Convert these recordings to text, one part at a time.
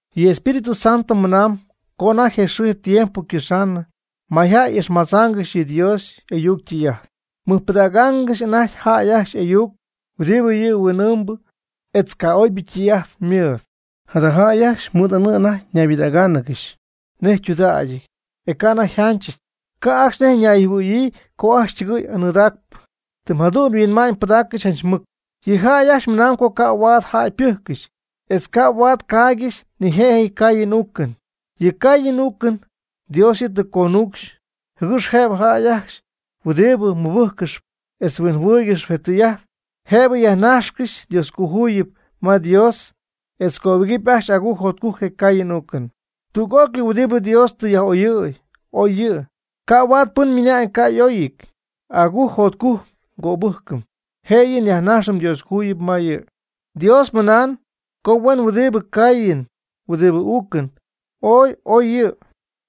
Yɨ Espíritu Santo mɨnaan co anajty je xɨɨ tiempo ycɨxa'ñ, mayjäy ixmadzaangɨxy yɨ Dios y'ayuc ytɨy'ajt. Mɨjpɨdaaccɨxy anajty jäy ajcxy y'ayuc huɨdibɨ yɨ huin'ɨɨmbɨ etz ca'oybɨ ytɨy'ajt mɨɨd. Jada jäy ajcxy mɨɨd anɨɨ anajty naybɨdáacɨgɨxy nej ytudägyɨty, e ca' anajty yjanchɨty. Ca' ajcxy nej ñayjɨhuɨ̈yii co ajcxy ytɨgɨɨy anɨɨdaacpɨ. Tɨ jadu'n yhuinma'ñypɨdaaccɨxy janch mɨc. Yɨ' ajcxy ymɨna'ñ co ca' huaad jäy ypɨjccɨxy, etz ca' huaad caaygɨxy nijëjɨty caayɨn uucɨn. Yɨ caayɨn uucɨn Dios yɨ' tɨ conucxy jɨgɨx jëbɨ jäy ajcxy huɨdibɨ mɨbɨjccɨxy etz huinjɨhuɨɨygɨxy je tɨy'ajt, jëbɨ yajnajxcɨxy Dioscojuyip ma Dios etz cöbɨgɨpy ajcxy agujc jotcujc je caayɨn uucɨn. Tüg'ócɨy huɨdibɨ Dios tɨ yaj'oyɨ̈y, oy yɨ'. Ca' huaad pɨn ymɨna'ñ co ca' y'oyɨty. Agujc jotcujc ngöbɨjcɨm, jëyɨ nyajnajxɨm Dioscojuyip ma yɨ'. Dios ymɨna'ñ co huen huɨdibɨ caayɨn huɨdibɨ uucɨn ooy y'oy yɨ'.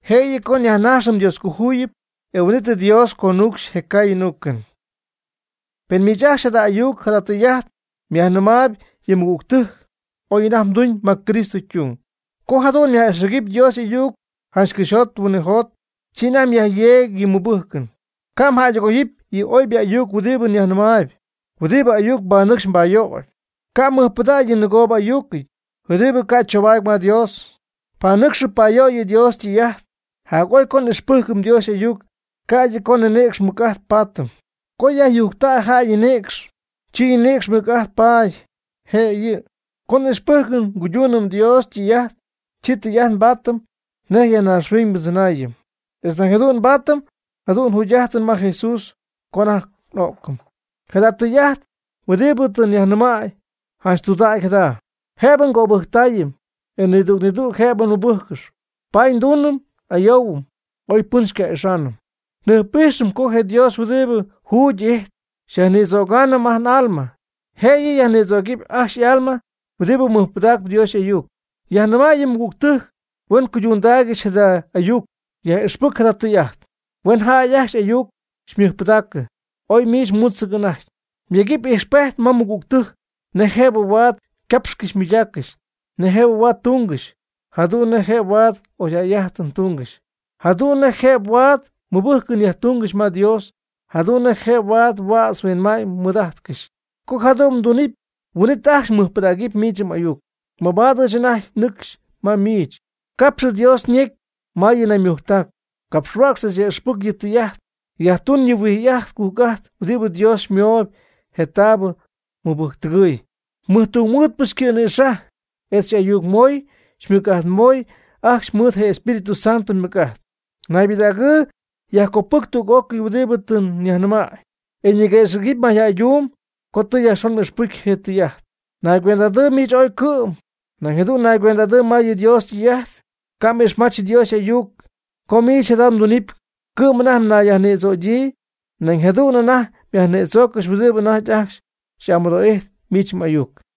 Jëyɨ co nyajnajxɨm Dioscojuyip, e huin'it Dios conuucxy je caayɨn uucɨn. Pen miich ajcxy jada ayuc jada tɨy'ajt myajnɨmaayb yɨ mɨgügtɨjc, oy anajty mduñ ma Cristo ytung. Co jadu'n myaj'ixpɨcy Dios y'ayuc janch cɨxyjot huinɨjot, chi anajty myajyeegy yɨ mmɨbɨjcɨn. Ca' mjäydɨgoyɨpy yɨ oybɨ ayuc huɨdibɨ nyajnɨmaayb, huɨdibɨ ayuc mbanɨcxyp mbayöyp. Ca' mmɨjpɨdägy yɨ nɨgoobɨ'ayucɨty huɨdibɨ ca' choobaady ma Dios. Panɨcxɨ' payöyɨ' Dios ytɨy'ajt. Jac'oy co n'ixpɨjcɨm Dios y'ayuc, ca'ydɨ co ninïcx ymɨc'ajt nbaatɨm. Co yajyujctäy jäy ñinïcx, chi ñinïcx ymɨc'ajt paady jëyɨ. Co n'ixpɨjcɨm nguyduunɨm Dios ytɨy'ajt, chi tɨy'ajt nbaatɨm nej ya naaxhuiñ ndzɨnaayɨm, etz nañ jadu'n nbaatɨm jadüg jugy'ajtɨn ma Jesús co anajty n'o'cɨm. Jada tɨy'ajt huɨdibɨ tɨ nyajnɨmäy, janch tudägy jada, jëbɨ ngöbɨjctaayɨm, e nidüg nidüg jëbɨ mɨbɨjccɨxy. Paady nduunɨm n'ayoohuɨm oy pɨn xyca'ixaanɨm. Njɨjp'ijxɨm co je Dios huɨdibɨ jugy'ijtp xyajnïdzögaanɨm n'alma. Jëyɨ yajnïdzögɨpy ajcxy y'alma huɨdibɨ mɨjpɨdaacɨp Dios y'ayuc. Yajnɨma' yɨ mɨgügtɨjc huen cuydundaaygɨxy jada ayuc. Yaj'ixpɨc jada tɨy'ajt. Huen jäy ajcxy m'ayuc xymɨjpɨdaacɨ, oy miich mutz anäcɨnɨty. Myegɨpy ijxpejt ma mɨgügtɨjc nej jëb huaad ycapxcɨxy ymɨydaaccɨxy, nej jëb huaad ytungɨxy, jadu'n nej jëb huaad oyjäy'ajtɨn tungɨxy, jadu'n nej jëb huaad mɨbɨjcɨn yajtungɨxy ma Dios, jadu'n nej jëb huaad huädz yhuinma'ñ mɨɨd'ajtcɨxy. Co jadu'n mdunɨpy, huin'it ajcxy mɨjpɨdägɨpy miich m'ayuc. Mabaad ɨɨch anajty nɨcxy ma miich, capx Dios ñecy ma yɨ naymujctac, capxhuäcx etz yaj'ixpɨc yɨ tɨy'ajt. Yajtun yɨ huij'ajt cujc'ajt huɨdibɨ Dios xymoy je taabɨ je mɨbɨjcpɨdɨjc mɨjtungmɨɨdpɨ xycɨ̈nïxajy, e xy'ayucmoy xymɨc'ajtmoy ajcxy mɨɨd je Espíritu Santo ymɨc'ajt. Naybɨdägɨɨ yajcopɨjc tüg'ócɨy huɨdibɨ tɨ nyajnɨmäy, e niguëxɨ̈gɨpy mayjäyduum co tɨ yajxon m'ixpɨcy je tɨy'ajt. Nayguend'adɨɨ miich ooy cɨ'm, nañ jadu'n naygüend'adɨɨ ma yɨ Dios ytɨy'ajt, ca' m'ixmach Dios y'ayuc. Co miich jada mdunɨpy cɨ'm anajty nayyajnïdzögyii, nañ jadu'n anajty myajnïdzooccɨxy huɨdibɨ anajty ajcxy amɨdoo'ijtp miich m'ayuc.